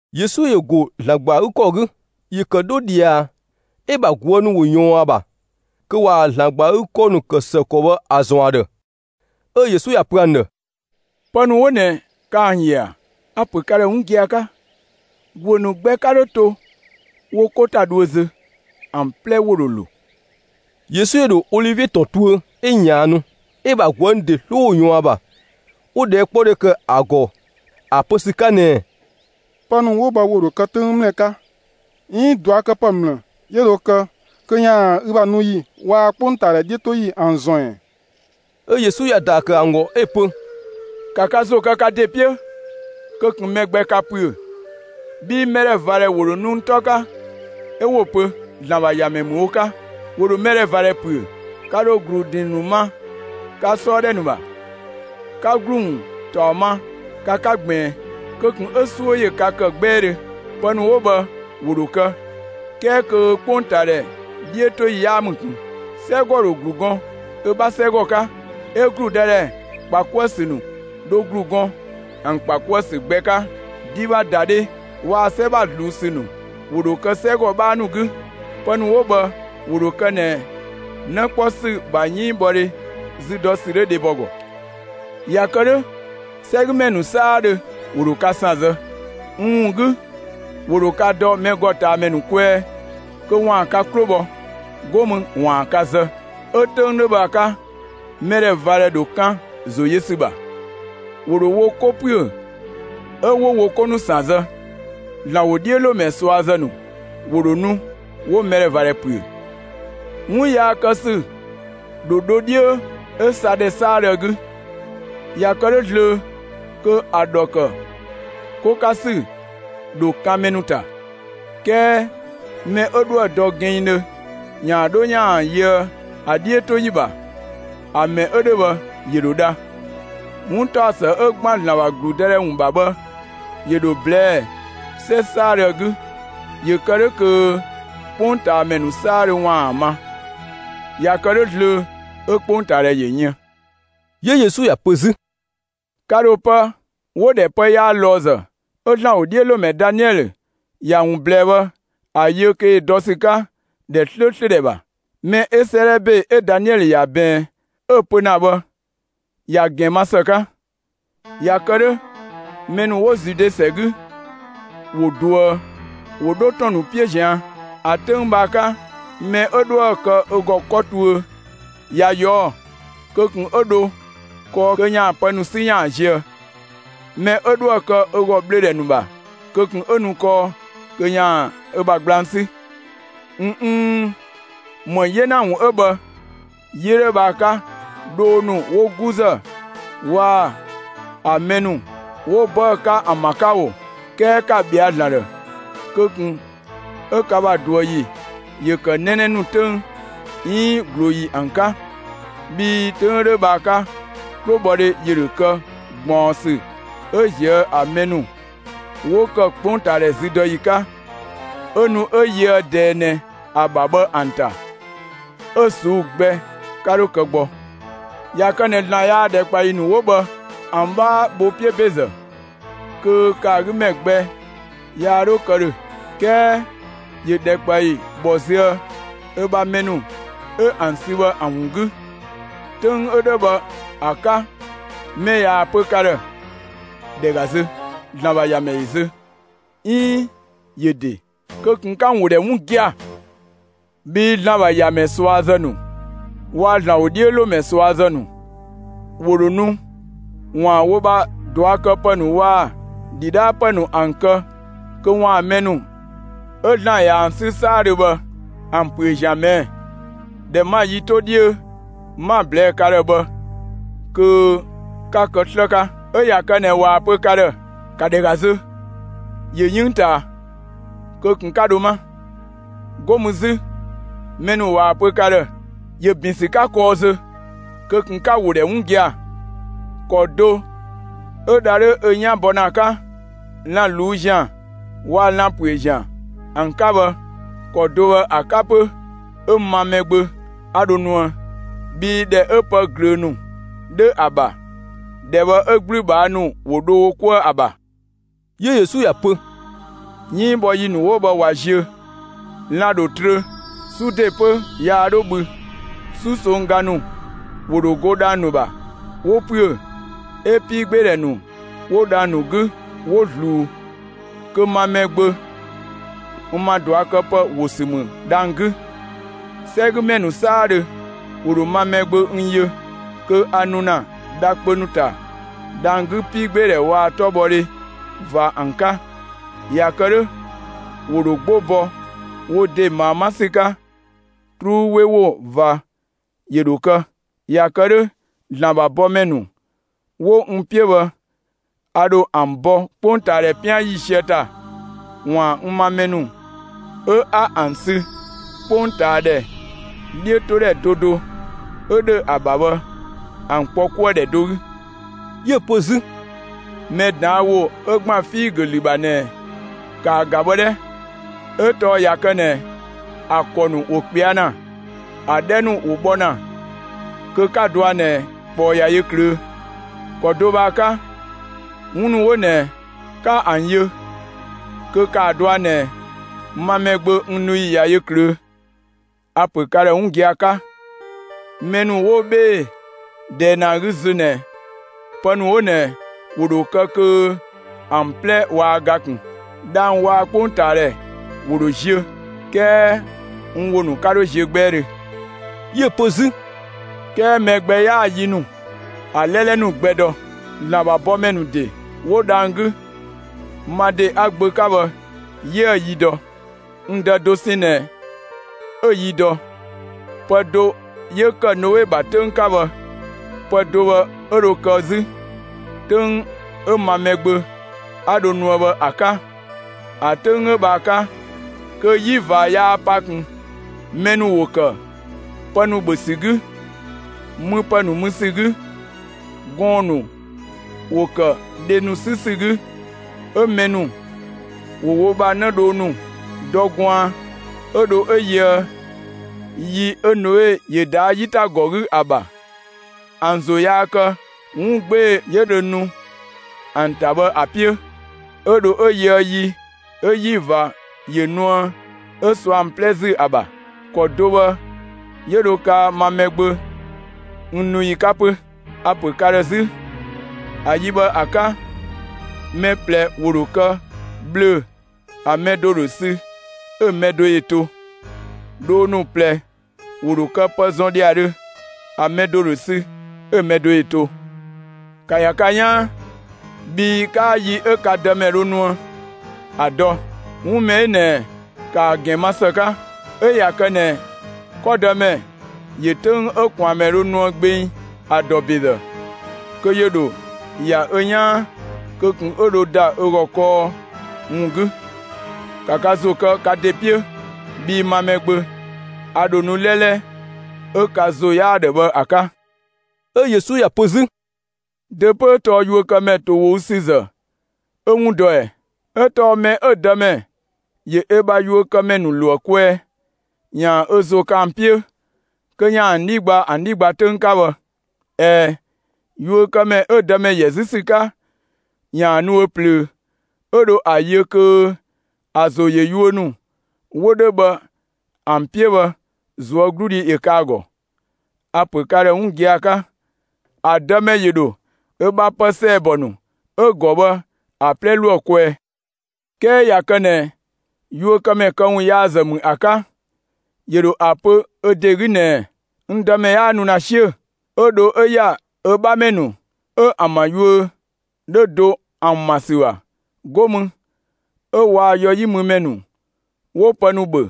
Yesu ‑yö ‑go ‑Zlan ‑gba ‑a 'gü ‑kɔ 'gü. ‑Yö ‑kë 'dho ꞊dhia, 'ö‑ ‑bha ꞊guë' ‑nu ‑wo ‑yɔɔn ‑a ‑bha kö ‑waan ‑Zlan ‑gba ‑a 'gü ‑kɔ ‑nu ‑kë ‑së ‑kɔ bhë ‑a ‑zɔn ‑a ‑dhë. 'Ö Yesu ‑ya pö ‑an ‑dhë: «Pë ‑nu 'wo ꞊nɛ, ka ‑an ‑yö ‑a? A‑ ‑pö ka ‑dhë 'wun gia‑ 'ka: ‑Guö ‑nu gbɛ 'ka 'dho to wo 'ko ‑ta dhuö zö, ‑an 'plɛ ‑wo ‑dho ‑lo.» Yesu ‑yö ‑dho Olivie ‑tɔn tuö, 'ö ꞊yaannu; 'ö‑ ‑bha ꞊guë' ‑nu ‑de 'sloo ‑wo ꞊yɔɔn ‑a ‑bha, 'wo ꞊dhɛɛkpɔdhe ‑kë ‑a ‑gɔ ‑a pö ‑sü 'ka ꞊nɛɛ: «Pë ‑nu 'wo bhë ‑wo ‑dho kë 'töng ‑mlë 'ka, 'iin ꞊duakëpë ‑mlë 'yö dho kë kö ‑yaan ü bha nu ‑yi waa‑ 'kpongtaadhɛ 'dhiötoyi ‑an ‑zɔn ‑ɛ?» 'Ö Yesu ‑ya ‑daa ‑kë ‑an ‑gɔ 'ö‑ pö: «‑Ka ka ‑zo kë ka ‑de 'piö kö ꞊kun mɛ gbɛ‑ ka ‑püö! Bhii mɛdhɛvadhɛ ‑wo ‑dho nu n 'tɔ 'ka 'ö 'wo‑ pö ‑Zlan ‑bha ‑Yamɛ ‑mü wo 'ka. ‑Wo ‑dho mɛdhɛvadhɛ ‑püö. Ka ‑dho ‑glu ‑drinng ‑nu ma ka 'sɔɔ ‑dhɛ ‑nu ‑bha; 'ka ‑glu ‑wun ‑taɔ ma ka 'ka ꞊gbiin. Kö ꞊kun 'ö 'suö ‑yö ka ‑kë 'gbɛɛdhö! Pë ‑nu 'wo bhë ‑wo ‑dho kë, 'kɛɛ kö 'kpongtaadhɛ 'dhiötoyi 'yaa ‑mü ꞊kun. 'Sɛgɔ ‑dho ‑glu gɔn ö 'bha 'sɛgɔ 'ka, 'ö ‑gludëdhɛ ‑kpa 'kuë‑ ‑sü nu dho ‑glu gɔn ‑an ‑kpa 'kuë‑ ‑sü gbɛ 'ka. Din ‑bha ‑da dhe waa‑ 'sɛ ‑bha ꞊zluun ‑sü ‑nu ‑dho kë 'sɛgɔ 'bhaa ‑nu 'gü. Pë ‑nu 'wo bhë ‑wo ‑dho kë ꞊nɛ 'në 'kpɔ ‑sü ‑bha 'yënngbhɔdhe zü dɔ ‑sü 'dhö dhebɔ ‑gɔ. ꞊Ya kë 'dhö 'sɛgümɛ ‑nu 'saadhö ‑wo ‑dho ka ‑san zë; n ‑wun 'gü ‑wo ‑dho ka dɔ mɛ ‑gɔ ꞊taa ‑mɛ ‑nu kwɛɛ kö ‑waan ka 'klo bhɔ, 'go mü ‑waan ka zë. 'Ö‑ 'töng 'dhö bhë ‑a 'ka, mɛdhɛvadhɛ ‑dho kan ‑zo yö ‑sü ‑bha; ‑wo ‑dho wo 'ko ‑püö, 'ö 'wo wo 'ko ‑nu ‑san zë. ‑Zlan ‑wodhiölomɛ ꞊suazë ‑nu ‑wo ‑dho nu, 'wo mɛdhɛvadhɛ ‑püö. 'Wun yaa kë ‑sü ‑dho dho 'dhiö 'ö sa ‑dhɛ 'saadhö ‑a 'gü. ꞊Ya kë 'dhö zlöö kö ‑a ‑dhɔ ‑kë 'ko 'ka ‑sü ‑dho kan mɛ ‑nu ‑ta. 'Kɛɛ mɛ 'ö 'dhoë‑ dɔ gɛnngdhö ‑yaan 'dho ‑yaan yöë ‑a 'dhiötoyi ‑bha, ‑a mɛ 'ö bhë ‑yö ‑dho dha. 'Wuntaɔsë 'ö ‑gban ‑Zlan ‑bha ‑gludëdhɛ ‑wun ‑bha bhë ‑yö ‑dho ꞊blɛɛ'‑ 'sɛ 'saadhö ‑a 'gü; ‑yö ‑kë 'dhö kö 'kpongtaamɛ ‑nu 'saadhö ‑waan ‑a ma. ꞊Ya kë 'dhö zlöö, 'ö 'kpongtaadhɛ ‑yö yën.» 'Yö Yesu ‑ya pö 'zü: «Ka ‑dho pë 'wo‑ ‑dhɛ «pë yaa ꞊lɔɔzë» 'ö ‑Zlan ‑wodhiölomɛ Daniɛlö ‑ya ‑wun ꞊blɛɛ bhë, ‑a yö kö ‑yö dɔ ‑sü 'ka ‑dhɛ 'slööslö ‑dhɛ ‑bha. Mɛ 'ö 'sëëdhɛ ‑be 'ö Daniɛlö ‑ya ꞊bɛɛn, 'yö‑ pö ‑na bhë ‑ya ‑gɛn ma ‑së 'ka! ꞊Ya kë 'dhö, mɛ ‑nu 'wo Zude ‑sɛ 'gü ‑wo ꞊duë, 'wo dho ‑tɔn ‑nu 'piö ꞊zian'. ‑A 'töng bhë ‑a 'ka, mɛ 'ö 'dhoë‑ kë ö ‑gɔ 'kɔ tuö, ꞊ya ꞊yɔɔ', kö ꞊kun 'ö dho kɔɔ kö ‑yaan pë ‑nu 'sü ‑yaan zië. Mɛ 'ö 'dhoë‑ kë ö ‑gɔ ꞊bhlöödhɛ ‑nu ‑bha, kö ꞊kun 'ö nu kɔɔ kö ‑yaan ö bha gblang 'sü. ꞊N 'n, ‑më 'yena ‑wun 'ö bhë yi 'ö 'dhö bhë ‑a 'ka, dhoo ‑nu 'wo 'guzë waa‑ ‑an mɛ ‑nu 'wo 'bëë‑ 'ka ‑an ‑bha 'ka ‑o! 'Kɛɛ ‑ka ‑bhɛa ‑Zlan ‑dhë kö ꞊kun 'ö ka ‑bha ꞊duë ‑yi ‑yö ‑kë 'nɛnɛ nu 'töng, 'iin ꞊glooyi ‑an 'ka! Bhii 'töng 'ö 'dhö bhë ‑a 'ka, 'klobhɔdhe ‑yö ‑dho kë ꞊gbaɔnsü, 'yö ꞊zië' ‑an mɛ ‑nu 'wo kë 'kpongtaadhɛ züdɔyi 'ka, 'ö nu 'ö yöë ꞊dɛɛ ꞊nɛ ‑a ‑bha bhë ‑an ‑ta, 'ö‑ ꞊suu'‑ gbɛ 'ka 'dho kë gbɔ. ꞊Ya kë ꞊nɛ ‑Zlan yaa ‑dhɛkpaɔyi ‑nu 'wo bhë ‑an 'bhaa bho 'piö ‑bezë, kö ‑kë ‑a 'gü ‑mɛ gbɛ 'yaa 'dhö kë ‑dhö. 'Kɛɛ ‑yö ‑dhɛkpaɔyi ‑bhɔ züë ö bha mɛ ‑nu 'ö ‑an sü bhë ‑an ‑wun 'gü. 'Töng 'ö 'dhö bhë ‑a 'ka mɛ ꞊yaa‑ pö ka ‑dhë: ‹‑Dhɛ ‑ga zö, ‑Zlan ‑bha ‑Yamɛ ‑yö zö!› 'iin ‹‑yö ‑de!›, kö ꞊kun 'ka‑ ‑wo ‑dhɛ 'wun gia‑! Bhii ‑Zlan ‑bha ‑Yamɛ ꞊suazë ‑nu waa‑ ‑Zlan ‑wodhiölomɛ ꞊suazë ‑nu ‑wo ‑dho nu ‑waan wo ‑bha ꞊duakëpë ‑nu waa‑ ‑dhidhaapë ‑nu ‑an kë kö ‑waan mɛ ‑nu 'ö ‑Zlan ꞊ya ‑an 'sü 'saadhö bhë ‑an ‑püö ‑sü ꞊mɛɛ'‑. ꞊Dhɛ 'ma‑ yi 'to 'dhiö 'ma‑ ꞊blɛɛ'‑ ka ‑dhë bhë kö 'ka kë 'slë 'ka! 'Ö ꞊ya kë ꞊nɛ ꞊waa‑ pö ka ‑dhë: ‹‑Ka ‑dhɛ ‑ga zö, ‑yö 'yënng ꞊taa!›, kö ꞊kun 'ka dho 'ma! 'Go mü 'zü, mɛ ‑nu ꞊waa‑ pö ka ‑dhë: ‹‑Yö ‑bin ‑sü 'ka kɔɔ zö›, kö ꞊kun 'ka‑ ‑wo ‑dhɛ 'wun gia‑! ‑Kɔ do 'ö dha 'dhö 'ö 'yan bɔ ‑na ‑a 'ka lan‑ ꞊luu'‑ ‑zian waa‑ lan‑ ‑püö ‑zian ‑an 'ka bhë, ‑kɔ do bhë ‑a 'ka 'pö, 'ö ma Mɛgbö 'a dho nuë. Bhii ‑dhɛ 'ö pë ꞊glöö ‑nu 'dhö ‑a ‑bha, ‑dhɛ bhë 'ö 'gblübhaa ‑nu ‑wo dho wo 'kuë‑ ‑a ‑bha.» 'Yö Yesu ‑ya pö: «'Yënngbhɔyi ‑nu 'wo bhë ꞊wa ziö, lan‑ ‑dho trö, 'su ‑de 'pö yaa 'dho bhü, 'susongga ‑nu ‑wo ‑dho go dhang‑ ‑nu ‑bha, 'wo ‑püö, 'ö 'piigbeedhɛ ‑nu 'wo dhang‑ ‑nu 'gü, 'wo ꞊zluu. Kö ma Mɛgbö n ‑ma ꞊duakëpë ‑wo ‑sü ‑mü dhang‑ 'gü. 'Sɛgümɛ ‑nu 'saadhö ‑wo ‑dho ma Mɛgbö n yö kö a nu ‑na dha kpö ‑nu ‑ta dhang‑ 'gü 'piigbeedhɛ waa‑ 'tɔbhɔdhe ꞊va ‑an 'ka. ꞊Ya kë 'dhö, ‑wo ‑dho 'gbo bɔ wo ‑de ꞊maa 'ma ‑sü 'ka. 'Truu 'we ‑wo ꞊va ‑yö ‑dho kë. ꞊Ya kë 'dhö, ‑Zlan ‑bha bɔmɛ ‑nu 'wo n 'piö bhë, a ‑dho ‑an bɔ 'kpongtaadhɛ 'pian ‑yiisië ‑ta, ‑waan n ‑ma mɛ ‑nu 'ö 'a ‑an sü 'kpongtaadhɛ 'dhiötodhɛ do do 'ö ‑dhö ‑a ‑bha bhë, ‑an kpɔ 'kuë‑ ‑dhɛ do 'gü.» 'Yö‑ pö 'zü: «Mɛ ꞊daan' ‑wo 'ö ‑gban figö ‑lü ‑bha ꞊nɛ, ‑kaa ‑ga bhë 'dhɛ: 'Ö tɔɔ ꞊ya kë ꞊nɛ ‑a ‑kɔ ‑nu ‑wo ꞊kpɛa' ‑na, ‑a 'dhɛ ‑nu ‑wo bhɔ ‑na, kö 'ka‑ dɔa ꞊nɛ ꞊kpɔɔ ꞊ya yö ꞊klöö'. ‑Kɔ do bhë ‑a 'ka, 'wun ‑nu 'wo ꞊nɛ 'ka ‑an yö, kö ‑kaa dɔa ꞊nɛ ma Mɛgbö n nu ‑yi ꞊ya yö ꞊klöö'. A‑ ‑pö ka ‑dhë 'wun gia‑ 'ka: Mɛ ‑nu 'wo 'bhee‑ ꞊dɛɛ ꞊nɛ ‑a 'gü zö ꞊nɛ, pë ‑nu 'wo ꞊nɛ ‑wo ‑dho kë kö ‑an 'plɛ waa ga ꞊kun. Dhang‑ waa‑ 'kpongtaadhɛ ‑wo ‑dho ziö, 'kɛɛ n ‑wo ‑nu 'ka 'dho ziö 'gbɛɛdhö» 'Yö‑ pö 'zü: «'Kɛɛ mɛ gbɛ 'yaa‑ yi ‑nu, ‑a 'lɛlɛ ‑nu gbɛ dɔ; ‑Zlan ‑bha bɔmɛ ‑nu ‑de 'wo dhang‑ 'gü, ma ‑de 'a‑ Gbö 'ka bhë, 'yiëë‑ yi dɔ; n Dë dosɛn ꞊nɛ 'ö‑ yi dɔ. Pë do 'yö ‑kë Noe ‑bha 'töng 'ka bhë, pë do bhë 'ö dho kë 'zü, 'töng 'ö ma Mɛgbö 'a dho nuë bhë ‑a 'ka. ‑A 'töng 'ö bhë ‑a 'ka kö 'yi ꞊va yaa pa ꞊kun, mɛ ‑nu ‑wo ‑kë pë ‑nu ‑bhö ‑sü 'gü, müpë ‑nu mü ‑sü 'gü; gɔɔn‑ ‑nu ‑wo ‑kë dhe ‑nu 'sü ‑sü 'gü, 'ö mɛ ‑nu ‑wo wo ‑bha 'në dhoo ‑nu dɔ gwaan 'ö dho 'ö yöë yi 'ö Noe ‑yö ꞊daa' 'yitagɔ 'gü ‑a ‑bha. ‑An ‑zo yaa kë 'wun 'gbee‑ 'yö dhö nu ‑an ‑ta bhë ‑a 'piö, 'ö dho 'ö yöë yi 'ö 'yi ꞊va ‑yö nuë, 'ö sɔ ‑an 'plɛ ‑zü ‑a ‑bha. ‑Kɔ do bhë 'yö dho kaa ma Mɛgbö n nu ‑yi 'ka 'pö. A‑ ‑pö ka ‑dhë 'zü: ‑A yi bhë ‑a 'ka, mɛ ꞊plɛ ‑wo ‑dho kë ꞊bhlöö‑, ‑a mɛ do ‑dho sü, 'ö‑ mɛ do ‑yö to. Dhoo ‑nu ꞊plɛ ‑wo ‑dho kë pë zɔn ‑dhiadhö, ‑a mɛ do ‑dho sü, 'ö‑ mɛ do ‑yö to. ‑Ka ‑ya ka 'yaan, bhii 'kaa yi 'ö ka Dëmɛ dho nuë ‑a dɔ. 'Wun mɛ 'ö ꞊nɛ ‑ka ‑a ‑gɛn ma ‑së 'ka! 'Ö ꞊ya kë ꞊nɛ 'kɔdëmɛ ‑yö 'töng 'ö ꞊kwaanmɛ dho nuë gbeng ‑a ‑dɔ ‑bezë, kö ‑yö ‑dho ‑ya ö 'yaan kö ꞊kun 'ö dho ‑da ö ‑gɔ kɔɔ ‑wun 'gü. ‑Ka ka ‑zo kë ka ‑de 'piö! Bhii ma Mɛgbö, a ‑dho nu 'lɛlɛ 'ö ka ‑zo 'yaa‑ ‑dhë bhë ‑a 'ka.» 'Ö Yesu ‑ya pö 'zü: «Dö 'pö 'ö tɔɔ yuökëmɛ ‑towogüsüzë 'ö 'wun dɔ ꞊ɛ? 'Ö tɔɔ mɛ 'ö‑ dëmɛ ‑yö ö bha yuökëmɛ ‑nu ‑lo ‑a kwɛɛ ‑yaan ö ‑zo kë ‑an 'piö, kö ‑yaan ‑an 'dhi gba ‑an 'dhi ‑gba 'töng 'ka bhë. ꞊Ɛɛ, yuökëmɛ 'ö‑ dëmɛ ‑yɛ 'zü ‑sü 'ka, ‑yaan nu ö plöö, 'ö dho ‑a yö kö ‑a ‑zo ‑yö yuö ‑nu 'wo 'dhö bhë ‑an 'piö bhë, ꞊zuögludhi ‑yö kë ‑a ‑gɔ. A‑ ‑pö ka ‑dhë 'wun gia‑ 'ka: ‑A dëmɛ ‑yö ‑dho ö ‑bha pë ‑sɛɛbɔ ‑nu 'ö‑ ‑gɔ bhë ‑a 'plɛ ‑lo ‑a kwɛɛ. 'Kɛɛ ꞊ya kë ꞊nɛ yuökëmɛ këwunyaazë ‑mü ‑a 'ka, ‑yö ‑dho ‑a pö ö ‑de 'gü ꞊nɛɛ: ‹N dëmɛ 'yaa nu ‑na 'siö‑›, 'ö dho ‑ya ö 'bhamɛ ‑nu 'ö ‑an ‑bha yuö 'dhö do ‑an ma ‑sü ‑bha; 'go mü 'ö waa‑ yɔ 'yi mü ‑mɛ ‑nu 'wo pë ‑nu ‑bhö,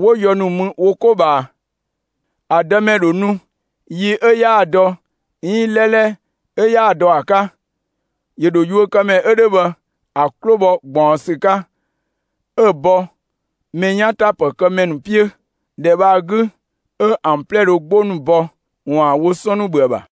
'wo yɔ ‑nu mü wo 'ko ꞊bhaa, ‑a dëmɛ ‑dho nu yi 'ö 'yaa‑ dɔ, 'iin 'lɛlɛ 'ö 'yaa‑ dɔ ‑a 'ka. ‑Yö ‑dho yuökëmɛ 'ö 'dhö bhë ‑a 'klo bhɔ ꞊gbaɔnsü 'ka, 'ö‑ bɔ mɛ 'yan ‑ta ‑pë kë ‑mɛ ‑nu 'piö. ‑Dhɛ bhë ‑a 'gü 'ö ‑an 'plɛ dhö 'gbo ‑nu bɔ ‑waan wo 'sɔn ‑nu ‑bhö ‑a ‑bha.»